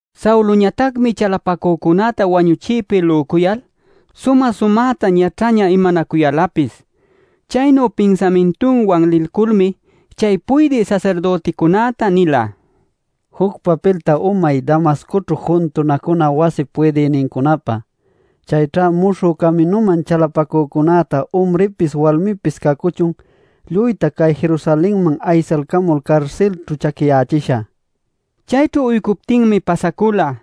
Sauloñatacmi chalapacücunäta wañuchïpi lücuyal sumä-sumäta ñaćhaña imanacuyälapis. Chaynu pinsamintunwan lilculmi chay puydï sasirdüticunäta nila: “Juc papilta umay Damascoćhu juntunacuna wasip puydïnincunapä. Chayćha Muśhü Caminuman chalapacücunäta umripis walmipis cacuchun lluyta cay Jerusalenman aysalcamul carsilćhu chaquiyächishä” nil. Chayćhu uycuptinmi pasacula.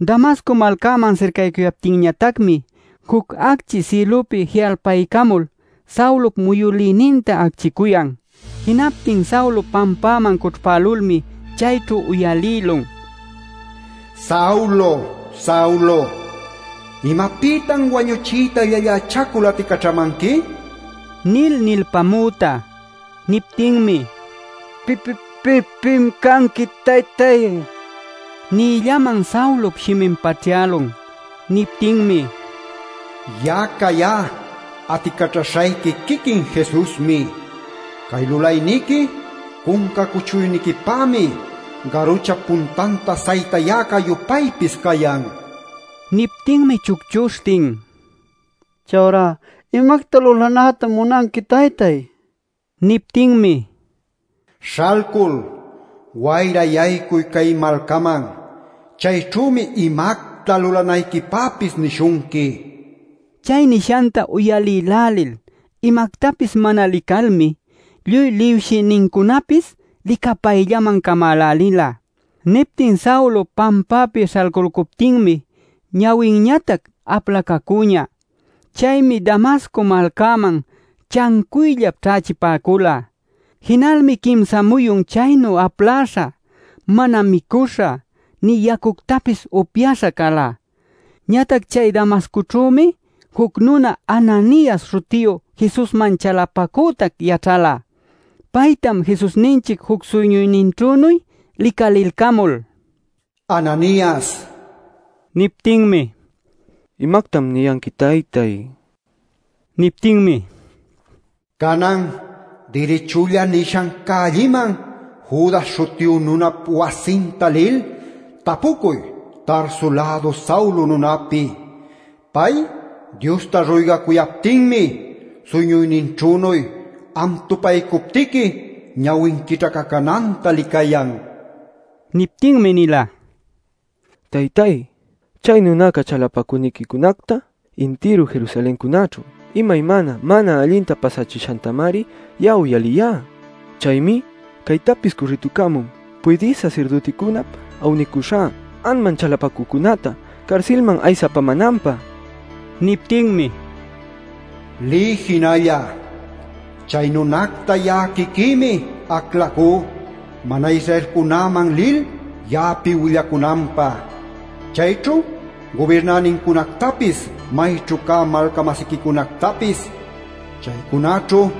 Damasco malcäman sircaycuyaptinñatacmi, juc acchi sïlupi ji'alpaycamul Saulop muyülïninta acchiycuyan. Jinaptin Saulo pampäman cućhpälulmi chayćhu uyalïlun: “Saulo, Saulo ¿imapïtan wañuchiyta llallächacul aticaćhamanqui?” nil nilpamüta. Niptinmi: “¿Pim canqui, taytay?” nïllaman Saulop shimin paćhyälun. Niptinmi: “Ya'a cayá aticaćhaśhayqui quiquin Jesusmi. ˻Cay lulayniqui cunca cuchuyniquipämi garuchap puntanta saytäcä-yupaypis cayan” nin. Niptinmi chucchuśhtin: “Chayurá ¿imacta lulanätam munanqui, taytay?” nicuyan.˼ Niptinmi: “Śhalcul, wayra yaycuy cay malcaman. Chayćhümi imacta lulanayquipäpis nishunqui” nin. Chay nishanta uyalïlälil imactapis mana licalmi lluy liwshïnincunapis licapayllaman camälälila. Niptin Saulo pampäpi śhalcüluptinmi ñawinñatac aplacacüñä. Chaymi Damasco malcäman chancuyllap ćhächipäcula. Jinalmi quimsa muyun chaynu aplaśha, mana micuśha nï yacuctapis upyaśha cala. Ñatac chay Damascoćhümi juc nuna Ananias śhutiyu Jesusman chalapacütac yaćhala. Paytam Jesusninchic juc suyñuyninćhünuy licalilcamul “Ananias” nila. Niptinmi: “¿Imactam niyanqui taytay?” nila. Niptinmi: “Canan Dirichulla nishan cällïman Judas śhutiyu nunap wasinta lil tapucuy Tarso-lädu Saulo nunapi. Pay Diosta ruygacuyaptinmi suyñuyninćhünuy, am tupaycuptiqui ñawin quićhacananta licayan” nin. Niptinmi nila: “Taytay, chay nunaca chalapacüniquicunacta intiru Jerusalencunaćhu imaymana mana allinta pasachishantamari ya'a uyaliyá. Chaymi caytapis cürrïtucämun puydï sasirdüticunap awniycuśha anman chalapacücunäta carsilman aysapämänanpä” nil. Niptinmi: “Liy jinalla. Chay nunacta ya'a quiquïmi aclacú mana-Israelcunäman lil ya'api willacunanpä, chayćhu gubirnänincunactapis mayćhu cä malca-masiquicunactapis. Chaycunaćhu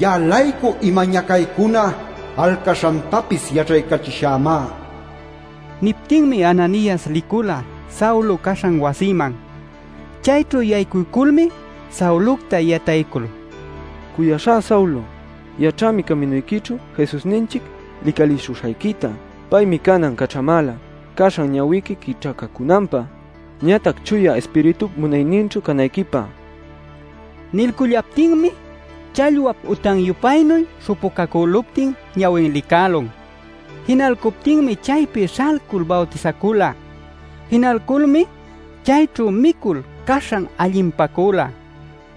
ya'a-laycu ima ñacaycuna alcaśhantapis yaćhaycachishämá” nin. Niptinmi Ananias licula Saulo caśhan wasiman. Chayćhu yaycuyculmi Saulocta yataycul: “Cuyaśhá Saulo, yaćhämi caminuyquićhu Jesusninchic licalishuśhayquita. Paymi canan caćhamäla caśhan ñawiqui quićhacacunanpä, ñatac Chuya Ispiritup munayninćhu canayquipä” nin. Nilcullaptinmi challwap utan-yupaynuy śhupucäluptin ñawin licälun. Jinalcuptinmi chaypi śhalcul bawtisacula. Jinalculmi cayćhu micul caśhan allinpacula.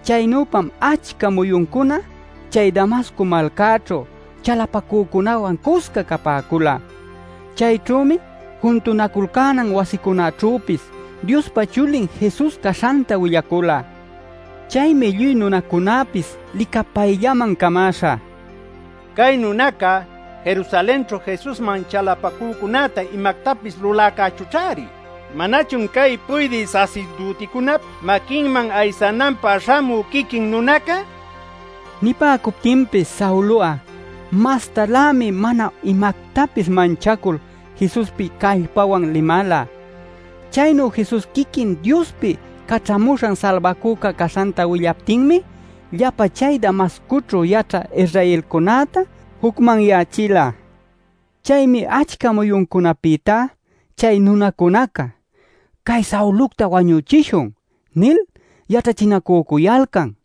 Chaynüpam achca muyuncuna chay Damasco malcäćhu chalapacücunäwan cusca capäcula. Chayćhümi juntunaculcänan wasicunaćhüpis Diospa Chulin Jesus caśhanta willacula. Chaymi lluy nunacunäpis licapayllaman camäśha: “Cay nunaca Jerusalenćhu Jesusman chalapacücunäta imactapis luläcächućh-ari. ¿Manachun cay puydï sasirdüticunap maquinman aysananpä śhamü quiquin nunaca?” nil ninacücuyalcan. Nipäcuptinpis Saulo'a mas-mastalämi mana imactapis manchacul Jesuspi callpawan limala. Chaynu Jesus quiquin Diospi Caćhamuśhan Salbacüca caśhanta willaptinmi llapa chay Damascoćhu yaćhä Israelcunäta jucmanyächila. Chaymi achca muyuncunapïtá chay nunacunaca “Cay Saulocta wañüchishun” nil yaćhachinacücuyalcan.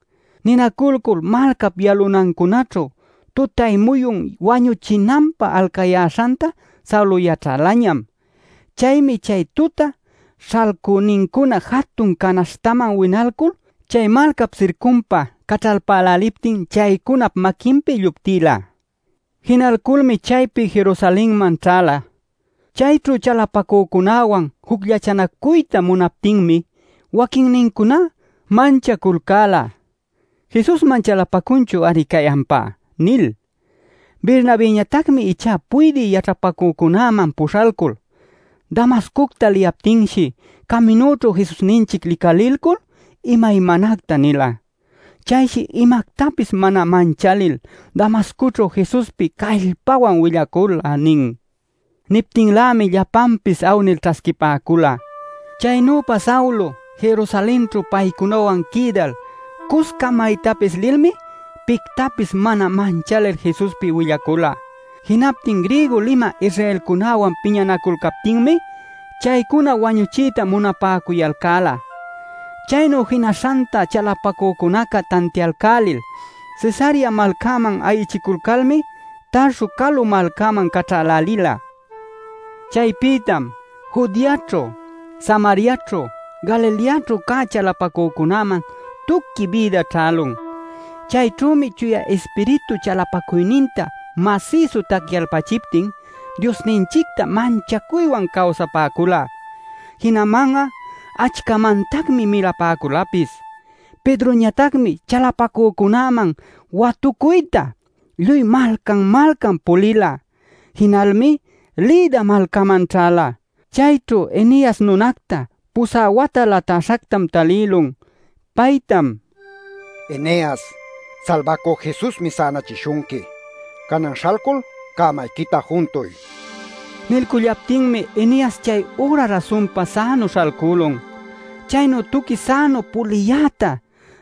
Ninaculcul malcap yalunancunaćhu tutay-muyun wañuchinanpä alcayalcäśhanta Saulo yaćhälañam. Chaymi chay tuta śhalcünincuna jatun canaśhtaman winaycul, chay malcap sircunpa caćhalpäläliptin chaycunap maquinpi lluptïla. Jinalculmi chaypi Jerusalenman ćhäla. Chayćhu chalapacücunäwan jucllachanacuyta munaptinmi waquinnincuná manchaculcäla “Jesusman chalapacunchu-ari cay ampá” nil. Bernabëñatacmi ichá puydï yaćhapacücunäman puśhalcul: “Damascocta liyaptinshi caminućhu Jesusninchic licalilcul imaymanacta nila. Chayshi imactapis mana manchalil Damascoćhu Jesuspi callpawan willacula” nin. Niptinlämi llapanpis awnil ćhasquipäcula. Chaynüpa Saulo Jerusalenćhu paycunawan quïdal cusca maytapis lilmi pictapis mana manchalil Jesuspi willacula. Jinaptin griego limä Israelcunäwan piñanaculcaptinmi chaycuna wañuchiyta munapäcuyalcäla. Chaynu jinaśhanta chalapacücunaca tantialcälil Cesarea malcaman ayichiculcalmi Tarso calu malcäman caćhälälila. Chaypïtam Judeaćhu, Samariaćhu, Galileaćhu cä chalapacücunäman tuqui bïda ćhälun. Chayćhümi Chuya Ispiritu chalapacuyninta masïsu tacyalpachiptin Diosninchicta manchacuywan cawsapäcula. Jinaman'a achcamantacmi milapäculapis. Pedroñatacmi chalapacücunäman watucuyta lluy malcan-malcan pulila. Jinalmi Lida malcäman ćhäla. Chayćhu Eneas nunacta pusä wata latäśhactam talïlun. Paytam: “Eneas, Salbacü Jesusmi sänachishunqui. Canan śhalcul cämayquita juntuy” nin. Nilcullaptinmi Eneas chay üra rasunpa sänu śhalcülun. Chaynu tuqui sänu puliyäta,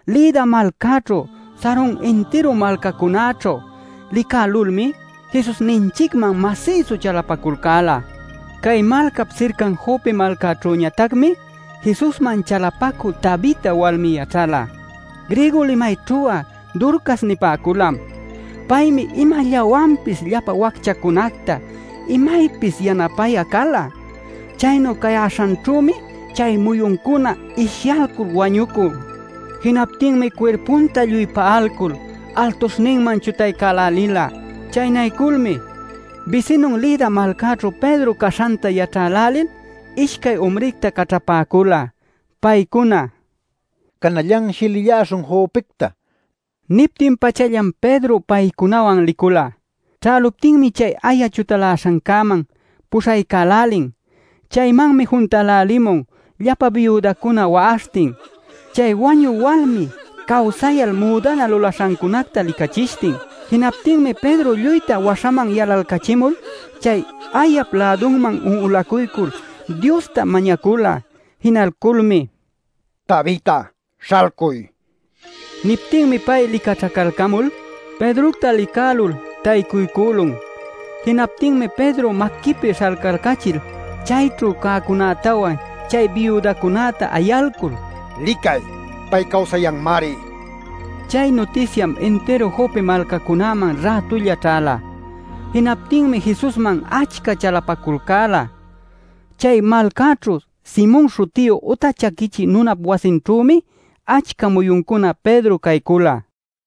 Lida malcäćhu, Saron intiru malcacunäćhu licälulmi, Jesusninchicman masïsu chalapaculcäla. Cay malcap sircan Jope malcaćhüñatacmi Jesusman chalapacü Tabita walmi yaćhala. (Griego limayćhu'a Dorcas nipäculam). Paymi imallawanpis llapa wacchacunacta imaypis yanapayä cala. Chaynu cayäśhanćhümi chay muyuncuna ishyalcul wañucun. Jinaptinmi cuirpunta lluy pa'aycul, altuśhninman chutaycälälila. Chaynayculmi bisinun Lida malcaćhu Pedro caśhanta yaćhälälil ishcay umricta caćhapäcula. Paycuna: “Canallanshi lilläśhun Jopecta” niptin-pachallam Pedro paycunawan licula. Ćhäluptinmi chay aya chutaläśhancäman puśhaycälälin. Chaymanmi juntälälimun llapa biudacuna wa'aśhtin, chay wañü walmi cawsayal müdana lulaśhancunacta licachishtin. Jinaptinmi Pedro lluyta waśhaman yalalcachimul, chay ayap lädunman un'ulacuycul Diosta mañacula. Jinalculmi “Tabita, ¡śhalcuy!” nila. Niptinmi pay licaćhacalcamul, Pedrocta licälul taycuycülun. Jinaptinmi Pedro maquipi śhalcalcachil chayćhu cäcunätawan chay biudacunäta ayalcul: “¡Licay! ¡Pay cawsayanmari!” nila. Chay nutisyam intiru Jope malcacunaman rätulla ćhäla. Jinaptinmi Jesusman achca chalapaculcäla. Chay malcaćhu Simon śhutiyu uta chaquichï nunap wasinćhümi achca muyuncuna Pedro caycula.